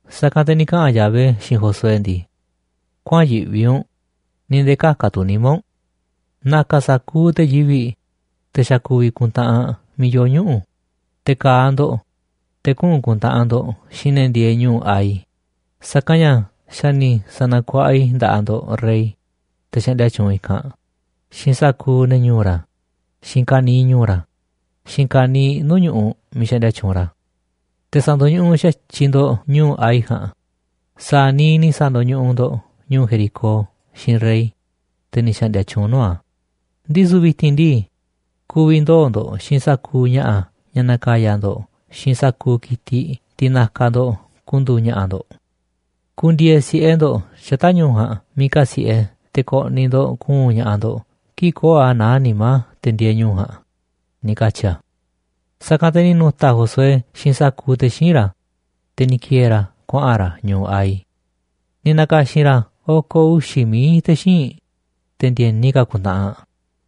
Sa̱kanꞌ te̱ ni̱ kaꞌa̱n Yahvé xiinꞌ Josué ndii: ―Kuäa̱nꞌ yiꞌvi u̱nꞌ, ni̱ nde̱e̱ kä̱ka̱ tu̱ nimá u̱nꞌ. Na̱ka̱ sa̱kuuꞌ te̱ yivi̱ꞌ, te̱ xa̱ ku̱vi̱ ku̱ntaꞌanꞌ miiꞌ yoo ñuꞌu̱, te̱ ka̱a̱ ndo̱ꞌ, te̱ kuꞌu̱n ku̱ntaꞌanꞌ ndo̱ꞌ xiinꞌ ne̱ ndieeꞌ ñu̱u̱ Hai. Sa̱kanꞌ ña̱ xa̱ ni̱ sa̱na̱kuaꞌa i̱ nda̱ꞌaꞌ ndo̱ꞌ rey, te̱ xaꞌndia tyuunꞌ i̱kanꞌ, xiinꞌ sa̱kuuꞌ ne̱ ñu̱u̱ ra̱, xiinꞌ ka̱niiꞌ ñu̱u̱ ra̱, xiinꞌ ka̱niiꞌ nuu̱ꞌ ñu̱ꞌuꞌ miiꞌ xaꞌndia tyuunꞌ ra̱. Te̱ sa̱ndo̱ñuꞌuꞌ xa̱tyiꞌ ndo̱ꞌ ñu̱u̱ Hai ja̱a̱nꞌ sa̱a̱ niiꞌ ni̱ sa̱ndo̱ñuꞌuꞌ ndo̱ꞌ ñu̱u̱ Jericó xiinꞌ rey, te̱ ni̱ xa̱ꞌndi̱a̱ tyuunꞌ nuu̱ꞌ a̱. Ndisu̱ vi̱ti̱n ndii, ku̱vi̱ ndoo̱ ndo̱ꞌ xiinꞌ sa̱kuuꞌ ña̱ꞌa̱ ña̱ na̱ka̱ya̱ ndo̱ꞌ xiinꞌ sa̱kuuꞌ ki̱tiꞌ, tiꞌ na̱ka̱ ndo̱ꞌ ku̱ndu̱u̱ ña̱ꞌa̱ ndo̱ꞌ. Ku̱ndi̱e̱e̱ si̱ꞌe ndo̱ꞌ xata̱ꞌ ñu̱u̱ ja̱a̱nꞌ miiꞌ kasi̱ꞌe te̱ ko̱ꞌni̱ ndo̱ꞌ ku̱u̱n ña̱ꞌaꞌ ndo̱ꞌ kii̱ꞌ köo̱ꞌ a̱ naá nimá te̱ ndieeꞌ ñu̱u̱ ja̱a̱nꞌ ―ni̱ katyi̱ a̱. Sa̱kanꞌ te̱ ni̱ nu̱ta̱ Josué xiinꞌ sa̱kuuꞌ te̱ xíinꞌ ra̱, te̱ ni̱ ki̱e̱e̱ ra̱ kuaꞌa̱n ra̱ ñu̱u̱ Hai. Ni̱ na̱ka̱xi̱n ra̱ oko̱ uxi̱ mií te̱ xíinꞌ, te̱ ndi̱e̱ni ka̱ ku̱ntaꞌanꞌ,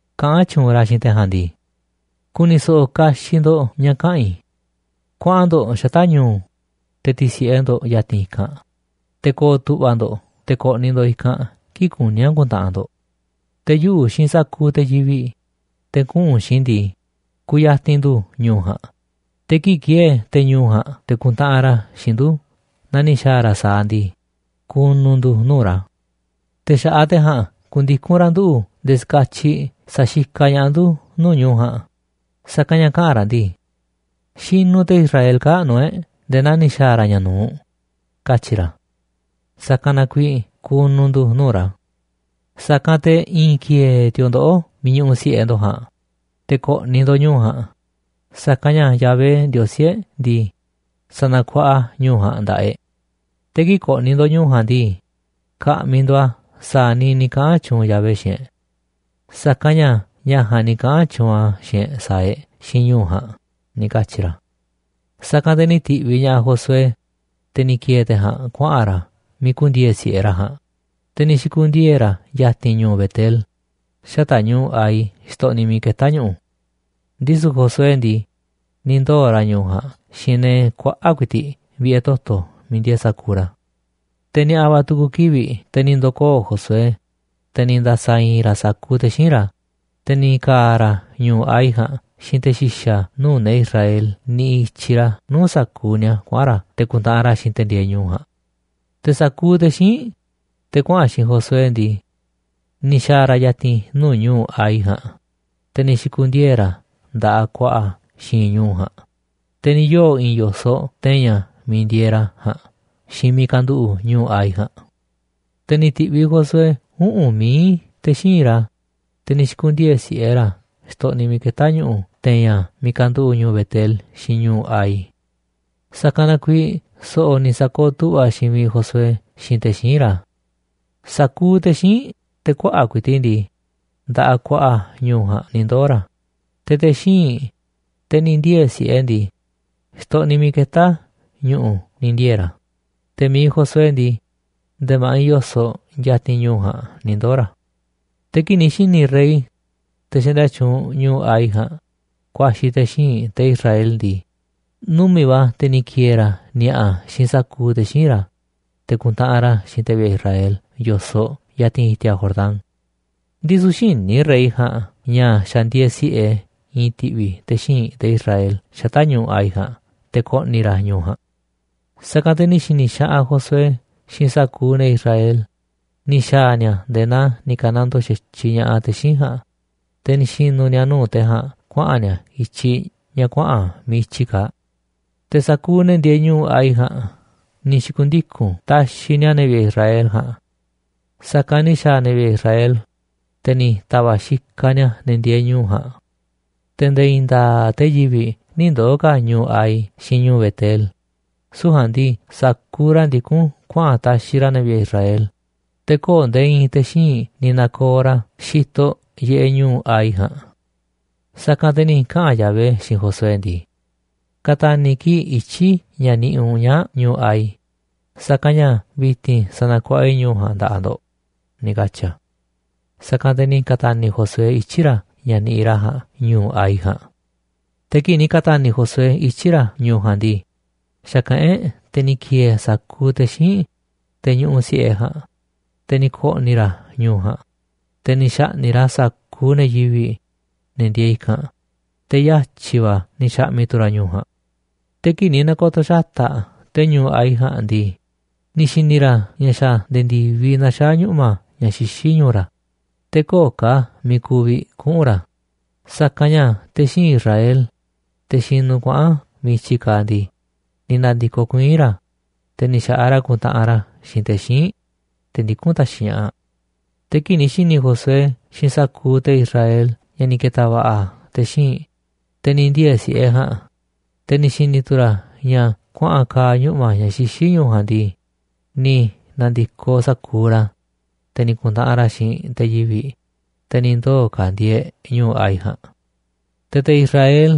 kaꞌán tyuunꞌ ra̱ xiinꞌ te̱ ja̱a̱nꞌ ndii: ―Ku̱ni̱ so̱ꞌo̱ kaxiꞌ ndo̱ꞌ ña̱ kaꞌa̱n i̱. Kuaꞌan ndo̱ꞌ xata̱ꞌ ñu̱u̱, te̱ ti̱si̱ꞌe ndo̱ꞌ ya̱ti̱n i̱kanꞌ, te̱ ko̱o̱ tu̱ꞌva̱ ndo̱ꞌ te̱ ko̱ꞌni̱ ndo̱ꞌ i̱kanꞌ kii̱ꞌ kuní a̱ ku̱ntaꞌanꞌ ndo̱ꞌ. Te̱ yuꞌu̱ xiinꞌ sa̱kuuꞌ te̱ yivi̱ꞌ, te̱ kuꞌu̱n xiinꞌ i̱ ndii, ku̱ya̱ti̱n ndu̱ ñu̱u̱ ja̱a̱nꞌ, te̱ kii̱ꞌ ki̱e̱e̱ te̱ ñu̱u̱ ja̱a̱nꞌ te̱ ku̱ntaꞌanꞌ ra̱ xiinꞌ ndu̱ naa ni̱ xa̱a̱ ra̱ sa̱aꞌ ndii, ku̱nu̱ ndu̱ nuu̱ꞌ ra̱. Te̱ xa̱ꞌaꞌ te̱ ja̱a̱nꞌ ku̱ndiku̱n ra̱ nduꞌu̱ nde̱e̱ ska̱tyiꞌ sa̱xikaꞌ ña̱ꞌaꞌ ndu̱ nuu̱ꞌ ñu̱u̱ ja̱a̱nꞌ, sa̱kanꞌ ña̱ kaꞌa̱n ra̱ ndii: “Xinuꞌ te̱ Israel kaa̱ꞌ nuu̱ꞌ e̱ꞌ nde̱e̱ naa ni̱ xa̱a̱ ra̱ ña̱ nu̱uꞌ”, katyi̱ ra̱. Sa̱kanꞌ na kuiiꞌ ku̱nu̱ ndu̱ nuu̱ꞌ ra̱. Sa̱kanꞌ te̱ i̱i̱n ki̱e̱e̱ ti̱o̱ ndoꞌó miiꞌ ñuꞌuꞌ si̱ꞌe ndo̱ꞌ ja̱a̱nꞌ, te̱ ko̱ꞌni̱ ndo̱ꞌ ñu̱u̱ ja̱a̱nꞌ, sa̱kanꞌ ña̱ Yahvé, Ndiosí e̱ꞌ ndii, sa̱na̱kuaꞌa a̱ ñu̱u̱ ja̱a̱nꞌ nda̱ꞌaꞌ e̱ꞌ. Te̱ kii̱ꞌ ko̱ꞌni̱ ndo̱ꞌ ñu̱u̱ ja̱a̱nꞌ ndii, ka̱ꞌmi̱ ndo̱ꞌ a̱ sa̱a̱ niiꞌ ni̱ kaꞌa̱n tyuunꞌ Yahvé xiinꞌ e̱ꞌ. Sa̱kanꞌ ña̱ ña̱ ja̱a̱nꞌ ni̱ kaꞌa̱n tyuunꞌ a̱ xiinꞌ e̱ꞌ sa̱a̱ e̱ꞌ xiinꞌ ñu̱u̱ ja̱a̱nꞌ ―ni̱ katyi̱ ra̱. Sa̱kanꞌ te̱ ni̱ ti̱ꞌviꞌ ña̱ꞌaꞌ Josué, te̱ ni̱ ki̱e̱e̱ te̱ ja̱a̱nꞌ kuaꞌa̱n ra̱ miiꞌ ku̱ndi̱e̱e̱ si̱ꞌe ra̱ ja̱a̱nꞌ, te̱ ni̱ xi̱ku̱ndiee̱ ra̱ ya̱ti̱n ñu̱u̱ Betel xata̱ꞌ ñu̱u̱ Hai xtoꞌniꞌ miiꞌ ketá ñu̱ꞌu̱. Ndisu̱ Josué ndii, ni̱ ndoo̱ ra̱ ñu̱u ja̱a̱nꞌ xiinꞌ ne̱ kuaꞌa̱ꞌ ku̱i̱ti̱ꞌ vi̱ꞌe̱ toto̱ miiꞌ ndieeꞌ sa̱kuuꞌ ra̱. Te̱ ni̱a̱ꞌa̱ va̱ tu̱ku̱ kivi̱ꞌ, te̱ ni̱ ndo̱koo̱ Josué, te̱ ni̱ nda̱sa̱ i̱i̱n ra̱ sa̱kuuꞌ te̱ xíinꞌ ra̱, te̱ ni̱ ka̱a̱ ra̱ ñu̱u̱ Hai ja̱a̱nꞌ xiinꞌ te̱ xi̱xa̱ nuu̱ꞌ ne̱ Israel niꞌiꞌ i̱tyiꞌ ra̱ nuu̱ꞌ sa̱kuuꞌ ni̱a̱ kuaꞌa̱n ra̱ te̱ ku̱ntaꞌanꞌ ra̱ xiinꞌ te̱ ndieeꞌ ñu̱u̱ ja̱a̱nꞌ. Te̱ sa̱kuuꞌ te̱ xíinꞌ, te̱ kuaꞌa̱n xiinꞌ Josué ndii, ni̱ xa̱a̱ ra̱ ya̱ti̱n nuu̱ꞌ ñu̱u̱ Hai ja̱a̱nꞌ, te̱ ni̱ xi̱ku̱ndiee̱ ra̱ nda̱ꞌaꞌ ku̱a̱ꞌa̱ a̱ xi̱i̱nꞌ ñu̱u̱ ja̱a̱nꞌ, te̱ ni̱ yoo̱ i̱i̱n yo̱soꞌ te̱i̱n a̱ miiꞌ ndieeꞌ ra̱ ja̱a̱nꞌ xiinꞌ mi̱iꞌ kanduꞌu̱ꞌ ñu̱u̱ Hai ja̱a̱nꞌ. Te̱ ni̱ ti̱ꞌviꞌ Josué uꞌu̱n mií te̱ xíinꞌ ra̱, te̱ ni̱ xi̱ku̱ndiee̱ si̱ꞌe ra̱ xtoꞌniꞌ miiꞌ ketá ñu̱ꞌu̱ te̱i̱n a̱ miiꞌ kanduꞌu̱ꞌ ñu̱u̱ Betel xiinꞌ ñu̱u̱ Hai. Sa̱kanꞌ na kuiiꞌ so̱ꞌo̱ ni̱ sa̱kooꞌ tu̱ꞌva̱ xiinꞌ miiꞌ Josué xiinꞌ te̱ xíinꞌ ra̱. Sa̱kuuꞌ te̱ xíinꞌ, te̱ kuaꞌa̱ꞌ ku̱i̱ti̱ꞌ ndii, nda̱ꞌaꞌ ku̱a̱ꞌa̱ ñu̱u̱ ja̱a̱nꞌ ni̱ ndoo̱ ra̱, te̱ te̱ xíinꞌ, te̱ ni̱ ndiee̱ si̱ꞌe ndii, xtoꞌniꞌ miiꞌ ketá ñu̱ꞌu̱ ni̱ ndiee̱ ra̱, te̱ mi̱iꞌ Josué ndii, nde̱e̱ ma̱ꞌiꞌ yo̱soꞌ ya̱ti̱n ñu̱u̱ ja̱a̱nꞌ ni̱ ndoo̱ ra̱. Te̱ kii̱ꞌ ni̱ xi̱ni̱ rey, te̱ xaꞌndia tyuunꞌ ñu̱u̱ Hai ja̱a̱nꞌ, ku̱a̱xi̱ te̱ xíinꞌ te̱ Israel ndii, numi̱ꞌ va̱ te̱ ni̱ ki̱e̱e̱ ra̱ ni̱a̱ꞌa̱ xiinꞌ sa̱kuuꞌ te̱ xíinꞌ ra̱, te̱ ku̱ntaꞌanꞌ ra̱ xiinꞌ te̱ vi̱ꞌe̱ Israel yo̱soꞌ ya̱ti̱n i̱ti̱a̱ Jordán. Ndisu̱ xïní rey ja̱a̱nꞌ ña̱ xa̱ ndieeꞌ si̱ꞌe i̱i̱n ti̱ꞌvi̱ te̱ xíinꞌ te̱ Israel xata̱ꞌ ñu̱u̱ Hai ja̱a̱nꞌ te̱ ko̱ꞌni̱ ra̱ ñu̱u̱ ja̱a̱nꞌ. Sa̱kanꞌ te̱ ni̱ xi̱ni̱ xaꞌanꞌ Josué xiinꞌ sa̱kuuꞌ ne̱ Israel, ni̱ xa̱a̱ ni̱a̱ nde̱e̱ naa ni̱ ka̱nandoo xa̱tyiꞌ ña̱ꞌaꞌ te̱ xíinꞌ ja̱a̱nꞌ, te̱ ni̱ xi̱nu̱ ni̱a̱ nuu̱ꞌ te̱ ja̱a̱nꞌ kuaꞌa̱n ni̱a̱ i̱tyiꞌ ña̱ kuaꞌa̱n miiꞌ i̱tyiꞌ kaaꞌ. Te̱ sa̱kuuꞌ ne̱ ndieeꞌ ñu̱u̱ Hai ja̱a̱nꞌ ni̱ xi̱ku̱ndiku̱n taxiꞌ ni̱a̱ ne̱ vi̱ꞌe̱ Israel ja̱a̱nꞌ. Sa̱kanꞌ ni̱ xa̱a̱ ne̱ vi̱ꞌe̱ Israel, te̱ ni̱ ta̱va̱ꞌ xikaꞌ ni̱a̱ ne̱ ndieeꞌ ñu̱u̱ ja̱a̱nꞌ. Te̱ nde̱e̱ i̱i̱n nda̱a̱ꞌ te̱ yivi̱ꞌ nï̱ ndoo̱ ka̱ ñu̱u̱ Hai xiinꞌ ñu̱u̱ Betel, süu̱ꞌ ja̱a̱nꞌ ndii, sa̱kuuꞌ ra̱ ndikún kuaꞌa̱n taxiꞌ ra̱ ne̱ vi̱ꞌe̱ Israel, te̱ köo̱ꞌ nde̱e̱ i̱i̱n te̱ xíinꞌ ni̱ na̱ko̱o̱ ra̱ xitoꞌ yiꞌeꞌ ñu̱u̱ Hai ja̱a̱nꞌ. Sa̱kanꞌ te̱ ni̱ kaꞌa̱n Yahvé xiinꞌ Josué ndii: ―Ka̱ta̱ni̱ kii̱ꞌ ityi̱ ña̱ niꞌiꞌ u̱nꞌ ñaa̱ꞌ ñu̱u̱ Hai, sa̱kanꞌ ña̱ vi̱ti̱n sa̱na̱kuaꞌa i̱ ñu̱u̱ ja̱a̱nꞌ nda̱ꞌaꞌ ndo̱ꞌ ―ni̱ katyi̱ a̱. Sa̱kanꞌ te̱ ni̱ ka̱ta̱ni̱ Josué ityi̱ ra̱ ña̱ niꞌiꞌ ra̱ ja̱a̱nꞌ ñu̱u̱ Hai ja̱a̱nꞌ. Te̱ kii̱ꞌ ni̱ ka̱ta̱ni̱ Josué ityi̱ ra̱ ñu̱u̱ ja̱a̱nꞌ ndii, xa̱kaꞌán e̱ꞌ te̱ ni̱ ki̱e̱e̱ sa̱kuuꞌ te̱ xíinꞌ, te̱ ñuꞌuꞌ si̱ꞌe ja̱a̱nꞌ, te̱ ni̱ ko̱ꞌni̱ ra̱ ñu̱u̱ ja̱a̱nꞌ, te̱ ni̱ xa̱ꞌni̱ꞌ ra̱ sa̱kuuꞌ ne̱ yivi̱ꞌ, ne̱ ndieeꞌ i̱kanꞌ, te̱ yatyi̱ va̱ ni̱ xa̱ꞌmi̱ tu̱ ra̱ ñu̱u̱ ja̱a̱nꞌ. Te̱ kii̱ꞌ ni̱ na̱ko̱to̱ xata̱ꞌ te̱ ñu̱u̱ Hai ja̱a̱nꞌ ndii, ni̱ xi̱ni̱ ra̱ ña̱ xa̱ nde̱e̱ ndi̱viꞌ naxaá ñuꞌma̱ ña̱ xixí ñu̱u̱ ra̱, te̱ köo̱ꞌ ka̱ miiꞌ ku̱vi̱ kuꞌu̱n ra̱, sa̱kanꞌ ña̱ te̱ xíinꞌ Israel, te̱ xinuꞌ kuaꞌa̱n miiꞌ i̱tyiꞌ kaaꞌ ndii, ni̱ na̱ndi̱koꞌ kuiín ra̱, te̱ ni̱ xa̱ꞌaꞌ ra̱ ku̱ntaꞌanꞌ ra̱ xiinꞌ te̱ xíinꞌ, te̱ ndikún taxiꞌ ña̱ꞌaꞌ. Te̱ kii̱ꞌ ni̱ xi̱ni̱ Josué xiinꞌ sa̱kuuꞌ te̱ Israel ña̱ ni̱ ke̱ta̱ va̱ꞌa̱ te̱ xíinꞌ, te̱ ni̱ ndiee̱ si̱ꞌe ja̱a̱nꞌ, te̱ ni̱ xi̱ni̱ tu̱ ra̱ ña̱ kuaꞌa̱n ka̱a̱ ñuꞌma̱ ña̱ xixí ñu̱u̱ ja̱a̱nꞌ ndii, ni̱ na̱ndi̱koꞌ sa̱kuuꞌ ra̱, te̱ ni̱ ku̱ntaꞌanꞌ ra̱ xiinꞌ te̱ yivi̱ꞌ, te̱ ni̱ ndoo̱ ka̱ ndieeꞌ ñu̱u̱ Hai ja̱a̱nꞌ. Te̱ te̱ Israel,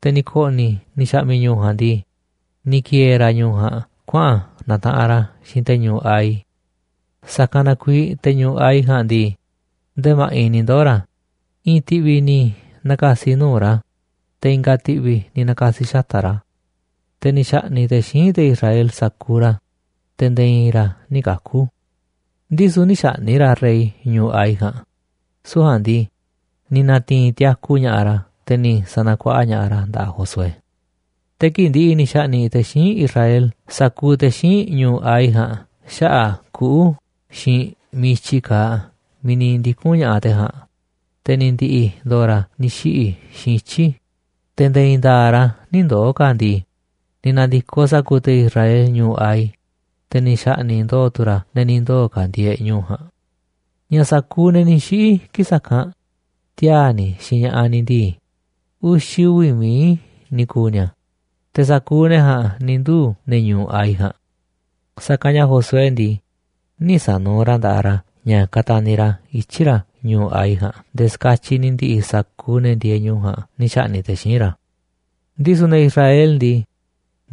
te̱ ni̱ ko̱ꞌni̱ ni̱ xa̱ꞌmi̱ ñu̱u̱ ja̱a̱nꞌ ndii, ni̱ ki̱e̱e̱ ra̱ ñu̱u̱ ja̱a̱nꞌ kuaꞌa̱n na̱taꞌanꞌ ra̱ xiinꞌ te̱ ñu̱u̱ Hai, sa̱kanꞌ na kuiiꞌ te̱ ñu̱u̱ Hai ja̱a̱nꞌ ndii, ndee ma̱ꞌiꞌ ni̱ ndoo̱ ra̱, i̱i̱n ti̱ꞌvi̱ ni̱ na̱ka̱si̱ nuu̱ꞌ ra̱, te̱ i̱nga̱ ti̱ꞌvi̱ ni̱ na̱ka̱si̱ xata̱ꞌ ra̱. Te̱ ni̱ xa̱ꞌni̱ꞌ te̱ xíinꞌ te̱ Israel sa̱kuuꞌ ra̱, te̱ nde̱e̱ i̱i̱n ra̱ nï̱ kaku̱. Ndisu̱ nï̱ xa̱ꞌni̱ꞌ ra̱ rey ñu̱u̱ Hai ja̱a̱nꞌ, süu̱ꞌ ja̱a̱nꞌ ndii, ni̱ na̱ti̱i̱n tiaku ña̱ꞌaꞌ ra̱, te̱ ni̱ sa̱na̱kuaꞌa ña̱ꞌaꞌ ra̱ nda̱ꞌaꞌ Josué. Te̱ kii̱ꞌ ndi̱ꞌi̱ ni̱ xa̱ꞌni̱ꞌ te̱ xíinꞌ Israel sa̱kuuꞌ te̱ xíinꞌ ñu̱u̱ Hai ja̱a̱nꞌ xaꞌa̱ꞌ kuꞌu̱ xiinꞌ miiꞌ i̱tyiꞌ kaaꞌ miiꞌ ni̱ ndiku̱n ña̱ꞌaꞌ te̱ ja̱a̱nꞌ, te̱ ni̱ ndi̱ꞌi̱ ndo̱o̱ ra̱ ni̱ xiꞌi̱ xiinꞌ ityi̱, te̱ nde̱e̱ i̱i̱n nda̱a̱ꞌ ra̱ nï̱ ndoo̱ ka̱ ndii, ni̱ na̱ndi̱koꞌ sa̱kuuꞌ te̱ Israel ñu̱u̱ Hai, te̱ ni̱ xa̱ꞌni̱ꞌ ndo̱o̱ tu̱ ra̱ ne̱ ni̱ ndoo̱ ka̱ ndieeꞌ ñu̱u̱ ja̱a̱nꞌ. Ña̱ sa̱kuuꞌ ne̱ ni̱ xiꞌi̱ kii̱ꞌ sa̱kanꞌ, tiaa̱ ni̱ xiinꞌ ña̱ꞌaꞌ ni̱ ndii, uxi̱ uvi̱ mií ni̱ ku̱u̱ ni̱a̱, te̱ sa̱kuuꞌ ne̱ ja̱a̱nꞌ ni̱ nduu̱ ne̱ ñu̱u̱ Hai ja̱a̱nꞌ. Sa̱kanꞌ ña̱ Josué ndii, nï̱ sa̱nuuꞌ ra̱ nda̱ꞌaꞌ ra̱ ña̱ kataniꞌ ra̱ ityi̱ ra̱ ñu̱u̱ Hai ja̱a̱nꞌ nde̱e̱ ska̱tyiꞌ ni̱ ndi̱ꞌi̱ sa̱kuuꞌ ne̱ ndieeꞌ ñu̱u̱ ja̱a̱nꞌ ni̱ xa̱ꞌni̱ꞌ te̱ xíinꞌ ra̱. Ndisu̱ ne̱ Israel ndii,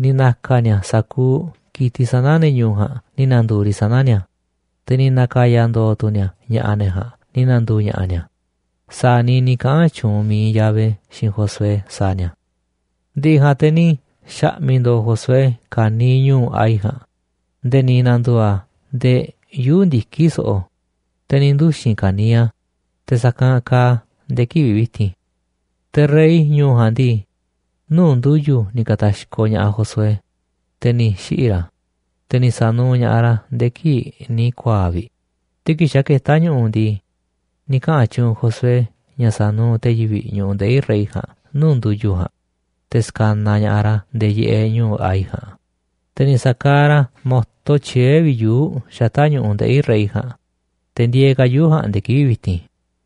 ni̱ na̱ka̱ ni̱a̱ sa̱kuuꞌ ki̱tiꞌ sana̱ ne̱ ñu̱u̱ ja̱a̱nꞌ ni̱ na̱ndu̱u̱ riꞌ sana̱ ni̱a̱, te̱ ni̱ na̱ka̱ya̱ ndo̱o̱ tu̱ ni̱a̱ ña̱ꞌa̱ ne̱ ja̱a̱nꞌ ni̱ na̱ndu̱u̱ ña̱ꞌa̱ ni̱a̱, sa̱a̱ niiꞌ ni̱ kaꞌa̱n tyuunꞌ mi̱iꞌ Yahvé xiinꞌ Josué sa̱a̱ ni̱a̱. Ndi̱ꞌi̱ ja̱a̱nꞌ te̱ ni̱ xa̱ꞌmi̱ ndo̱o̱ Josué ka̱niiꞌ ñu̱u̱ Hai ja̱a̱nꞌ nde̱e̱ ni̱ na̱ndu̱u̱ a̱ ndee yuu̱ꞌ ndiki̱ so̱ꞌo̱, te̱ ni̱ nduxi̱n ka̱niiꞌ a̱, te̱ sa̱kanꞌ kaaꞌ a̱ nde̱e̱ kivi̱ꞌ vi̱ti̱n. Te̱ rey ñu̱u̱ ja̱a̱nꞌ ndii, nuu̱ꞌ ndu̱yu̱ ni̱ ka̱ta̱xkoꞌ ña̱ꞌaꞌ Josué, te̱ ni̱ xiꞌi̱ ra̱, te̱ ni̱ sa̱nuuꞌ ña̱ꞌaꞌ ra̱ nde̱e̱ kii̱ꞌ ni̱ ku̱a̱a̱ꞌ vi̱ꞌ, te̱ kii̱ꞌ xa̱ ketá ñu̱ꞌu̱ ndii, ni̱ kaꞌa̱n tyuunꞌ Josué ña̱ sa̱nuuꞌ te̱ yivi̱ꞌ ñu̱ꞌuꞌ ndeꞌi̱ rey ja̱a̱nꞌ nuu̱ꞌ ndu̱yu̱ ja̱a̱nꞌ, te̱ ska̱naꞌ ña̱ꞌaꞌ ra̱ yiꞌeꞌ ñu̱u̱ Hai ja̱a̱nꞌ, te̱ ni̱ sa̱kaaꞌ ra̱ mo̱to tyiee̱ vi̱ꞌ yuu̱ꞌ xata̱ꞌ ñu̱ꞌuꞌ ndeꞌi̱ rey ja̱a̱nꞌ, te̱ ndieeꞌ ka̱ yuu̱ꞌ ja̱a̱nꞌ nde̱e̱ kivi̱ꞌ vi̱ti̱n.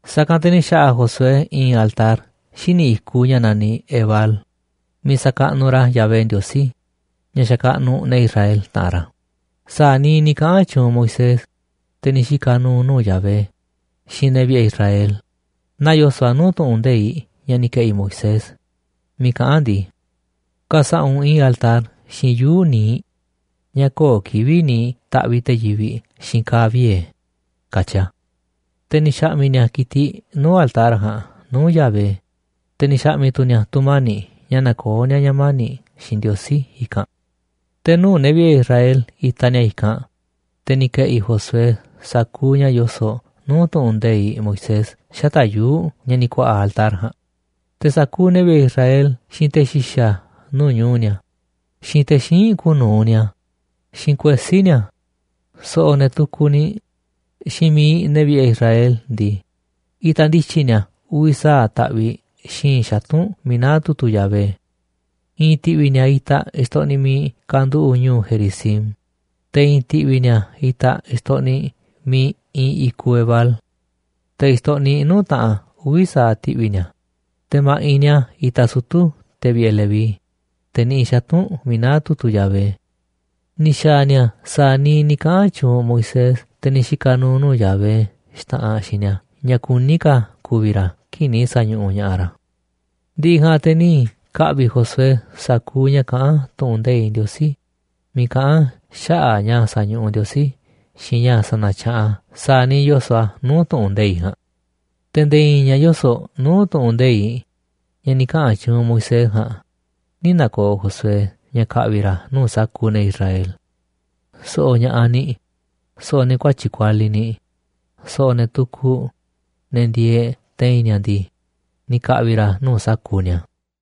Sa̱kanꞌ te̱ ni̱ xa̱ꞌa̱ Josué i̱i̱n altar xíniꞌ i̱kuꞌ ña̱ naniꞌ Ebal miiꞌ sa̱kaꞌnuꞌ ra̱ Yahvé, Ndiosí ña̱ xakaꞌnuꞌ ne̱ Israel, taꞌanꞌ ra̱, sa̱a̱ niiꞌ ni̱ kaꞌa̱n tyuunꞌ Moisés, te̱ ni̱ xika̱ nu̱u̱ nuu̱ꞌ Yahvé, xiinꞌ ne̱ vi̱ꞌe̱ Israel, naa yoso̱ꞌ a̱ nuu̱ꞌ tu̱ꞌu̱n nde̱iꞌ ña̱ ni̱ ke̱ꞌi̱ Moisés, miiꞌ kaꞌán a̱ ndii: “Ka̱sa̱ꞌa̱ u̱nꞌ i̱i̱n altar xiinꞌ yuu̱ꞌ niiꞌ, ña̱ köo̱ꞌ kivi̱ꞌ ni̱ taꞌviꞌ te̱ yivi̱ꞌ xiinꞌ ka̱a̱ viee̱”, katyi a̱. Te̱ ni̱ xa̱ꞌmi̱ ni̱a̱ ki̱tiꞌ nuu̱ꞌ altar ja̱a̱nꞌ nuu̱ꞌ Yahvé, te̱ ni̱ xa̱ꞌmi̱ tu̱ ni̱a̱ tu̱mani̱ꞌ ña̱ nakoó ni̱a̱ ña̱ mani̱ꞌ xiinꞌ Ndiosí i̱kanꞌ. Te̱ nuu̱ꞌ ne̱ vi̱ꞌe̱ Israel itaꞌ ni̱a̱ i̱kanꞌ, te̱ ni̱ ke̱ꞌi̱ Josué sa̱kuuꞌ ña̱ yoso̱ꞌ nuu̱ꞌ tu̱ꞌu̱n nde̱iꞌ Moisés xata̱ꞌ yuu̱ꞌ ña̱ ni̱ ku̱a̱ꞌa̱ altar ja̱a̱nꞌ. Te̱ sa̱kuuꞌ ne̱ vi̱ꞌe̱ Israel, xiinꞌ te̱ xi̱xa̱ nuu̱ꞌ ñu̱u̱ ni̱a̱, xiinꞌ te̱ xíinꞌ kuuꞌ nu̱uꞌ ni̱a̱, xiinꞌ kuesí ni̱a̱, so̱ꞌo̱ ne̱ tukuꞌ niꞌ, xiinꞌ mi̱iꞌ ne̱ vi̱ꞌe̱ Israel ndii, itaꞌ ndi̱tyi̱ ni̱a̱ uvi̱ sa̱aꞌ taꞌviꞌ xi̱i̱nꞌ xatu̱nꞌ miiꞌ naá tu̱tu̱ Yahvé. I̱i̱n ti̱ꞌvi̱ ni̱a̱ itaꞌ xtoꞌniꞌ miiꞌ kanduꞌu̱ꞌ ñu̱u̱ Gerizim, te̱ i̱i̱n ti̱ꞌvi̱ ni̱a̱ itaꞌ xtoꞌniꞌ miiꞌ iinꞌ i̱kuꞌ Ebal. Te̱ xtoꞌniꞌ nuu̱ꞌ taꞌanꞌ uvi̱ sa̱aꞌ ti̱ꞌvi̱ ni̱a̱, te̱ ma̱ꞌiꞌ ni̱a̱ itaꞌ sutu̱ te̱ vi̱ꞌe̱ Leví, te̱ niꞌiꞌ xatu̱nꞌ miiꞌ naá tu̱tu̱ Yahvé. Ni̱ xa̱a̱ ni̱a̱ sa̱a̱ niiꞌ ni̱ kaꞌa̱n tyuunꞌ Moisés, te̱ ni̱ xika̱ nu̱u̱ nuu̱ꞌ Yahvé, xta̱ꞌanꞌ xiinꞌ ni̱a̱ ña̱ kuní ka̱ ku̱vi̱ ra̱ kii̱ꞌ ni̱ sa̱ñuꞌuꞌ ña̱ꞌaꞌ ra̱. Ndi̱ꞌi̱ ja̱a̱nꞌ te̱ ni̱ ka̱ꞌvi̱ Josué sa̱kuuꞌ ña̱ kaꞌán tu̱ꞌu̱n nde̱iꞌ Ndiosí, miiꞌ kaꞌán a̱ xaꞌa̱ꞌ ña̱ sa̱ñuꞌuꞌ Ndiosí xiinꞌ ña̱ sa̱na̱tyaꞌanꞌ a̱ sa̱a̱ niiꞌ yoso̱ꞌ a̱ nuu̱ꞌ tu̱ꞌu̱n nde̱iꞌ ja̱a̱nꞌ. Te̱ nde̱e̱ i̱i̱n ña̱ yoso̱ꞌ nuu̱ꞌ tu̱ꞌu̱n nde̱iꞌ ña̱ ni̱ kaꞌa̱n tyuunꞌ Moisés ja̱a̱nꞌ, nï̱ na̱ko̱o̱ Josué ña̱ ka̱ꞌvi̱ ra̱ nuu̱ꞌ sa̱kuuꞌ ne̱ Israel. So̱ꞌo̱ ña̱ꞌaꞌ ni̱, so̱ꞌo̱ ne̱ kuatyi̱ꞌ kualiꞌ ni̱, so̱ꞌo̱ ne̱ tukuꞌ, ne̱ ndieeꞌ te̱i̱n ni̱a̱ ndii, ni̱ ka̱ꞌvi̱ ra̱ a̱ nuu̱ꞌ sa̱kuuꞌ ni̱a̱.